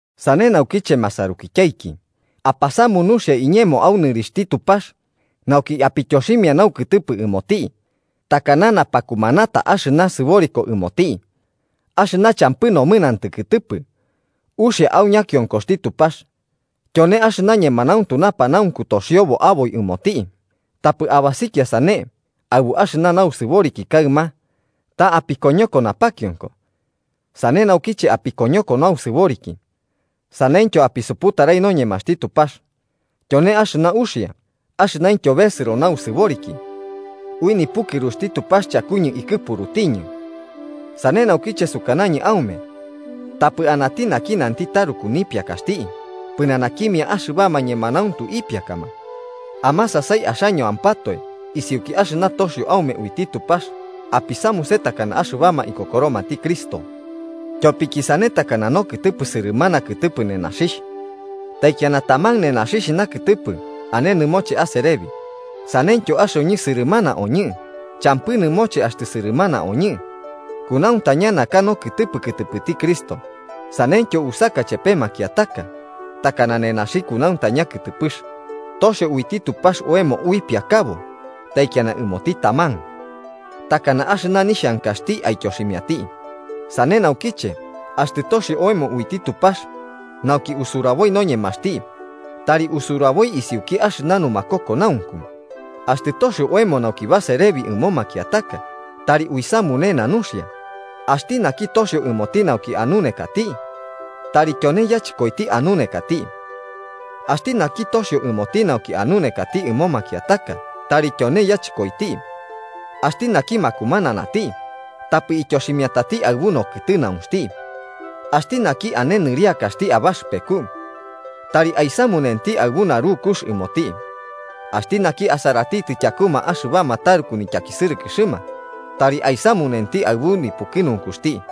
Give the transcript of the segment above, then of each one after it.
Sane naukiche masarukityaiki, apasamu nuxia iñemo au nɨrixhti Tupax nauki apityoximia naukɨtɨpɨ ɨmoti, takana napakumanata axɨna sɨboriko ɨmoti, axɨna champɨ nomɨnantɨ kɨtɨpɨ, uxia au ñakionkoxti Tupax, tyone axɨna ñemanauntu napanaunku toxiobo aboi ɨmoti. Tapɨ abasikia sane aɨbu axɨna nausɨboriki kaɨma, ta apikoñoko napakionko sane nauki apikoñoko nausɨboriki saneityo apisuputarai noñemaxti Tupax, tyone axɨna uxia axɨnaintyo besɨro nausɨboriki. Ui nipukɨruxti Tupax chakuñɨ ikɨpurutiñɨ, sane naukiche sukanañɨ aume tapɨ anati naki nanti taruku nipiakaxti pɨnanakimia axɨbama ñemanauntu ipiakama. Amasasai axañoampatoe isiuki axɨna toxio aume uiti Tupax apisamuse takana axɨbama ikokoromati Cristo. Tyopiki sane takana nokɨtɨpɨ sɨrɨmana kɨtɨpɨ nenaxixh, taikiana taman nenaxi nakɨtɨpɨ ane nɨmoche aserebi. Saneityo axoñɨ, sɨrɨmana oñɨ, champɨ nɨmoche axtɨ sɨrɨmana oñɨ, kunauntaña naka nokɨtɨpɨ kɨtɨpɨti Cristo, sanentyo usaka ichepe makiataka takana nenaxi kunauntaña kɨtɨpɨx. Toxio uiti Tupax oemo uipiakabo taikiana ɨmoti taman, takana axɨna nixhankaxti aityoximiati. Sane naukiche, axtɨ toxio oemo uiti Tupax nauki usuraboi noñemaxti tari usuraboi isiuki axɨna numakokonaunku. Axtɨ toxio oemo nauki baserebi ɨmo makiataka, tari uisamunena nuxia. Axti naki toxio ɨmoti nauki anunekati, tari tyone yachɨkoiti anunekati. Axti naki toxio ɨmoti nauki anunekati ɨmo makiataka, tari tyone yachɨkoiti. Axti naki makumananati tapɨ ityoximiatati aɨbu nokɨtɨnaunxti. Axti naki ane nɨriakaxti abaxɨpeku, tari aisamunenti aɨbu narukux ɨmoti. Axti naki asaratitɨ tyakuma axɨbama taruku nityakisɨrɨkɨxɨma, tari aisamunenti aɨbu nipukɨnunkuxti.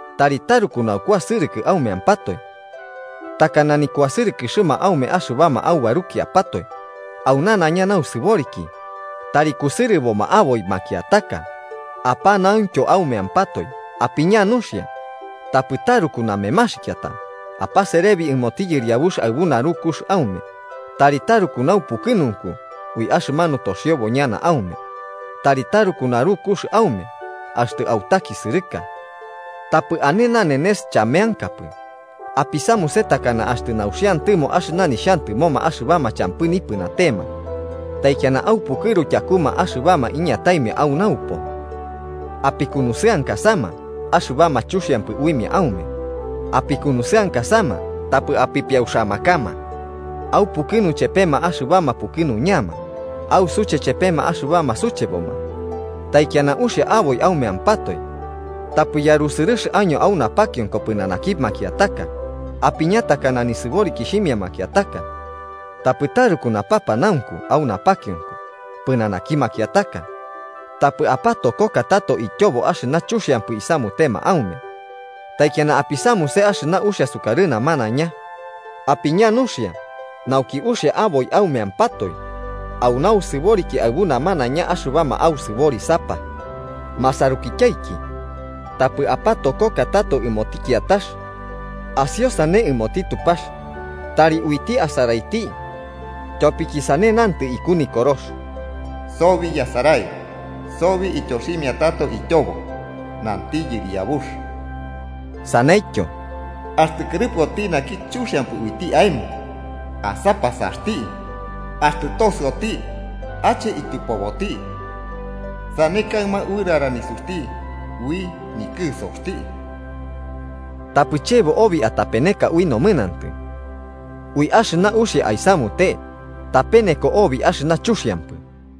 Tari taruku naukuasɨrɨkɨ aumeampatoe, takana nikuasɨrɨkɨxɨma aume axɨbama aubarukiapatoe, au nanaiña nausɨboriki tari kusɨrɨboma aboi makiataka apanauntyo aumeampatoe. Apiña nuxia, tapɨ taruku namemaxikiata, apaserebi ɨmoti Yɨriabux aɨbu narukux aume. Tari taruku naupukɨnunku ui axɨmanu toxiobo ñana aume. Tari taruku narukux aume axtɨ autakisɨrɨka. Tapɨ ane nanenes chameankapɨ. Apisamuse takana axtɨ nauxiantɨmo axɨna nixhantɨmoma axɨbama champɨ nipɨnatema, taikiana aupukɨru tyakuma axɨbama iñataimia au naupo. Apikunusɨankasama axɨbama chuxiampɨ uimia aume. Apikunusɨankasama, tapɨ apipiauxamakama. Aupukɨnu chepema axɨbama pukɨnuñama. Ausuche chepema axɨbama sucheboma. Taikiana uxia aboi aumeampatoe. Tapɨ yarusɨrɨx año au napakionko pɨnanaki makiataka, apiña takana nisɨborikixhimia makiataka, tapɨ taruku napapanaunku au napakionko pɨnanaki makiataka. Tapɨ apatokoka tato ityobo axɨna chuxiampɨ isamutema aume. Taikiana apisamuse axɨna uxia sukarɨ namanaiña. Apiña nuxia, nauki uxia aboi aumeampatoe au nausɨboriki aɨbu namanaiña axɨbama ausɨborisapa. Masarukityaiki, tapɨ apatokoka tato ɨmoti kiatax, asiosane ɨmoti Tupax, tari uiti asaraiti. Tyopiki sane nantɨ iku Nikorox: “Sobi yasarai. Sobi ityoximia tato ityobo, nanti Yɨriabux.” Saneityo: “Axtɨ kɨrɨpɨoti naki chuxiampɨ uiti aemo, asapasati. Axtɨ tosɨoti, ache tyɨpoboti. Sane kaɨma uɨrara nisuxti ui nikɨsoxti.” Tapɨ chebo obi atapeneka ui nomɨnantɨ. Ui axɨna uxia aisamute tapeneko obi axɨna chuxiampɨ.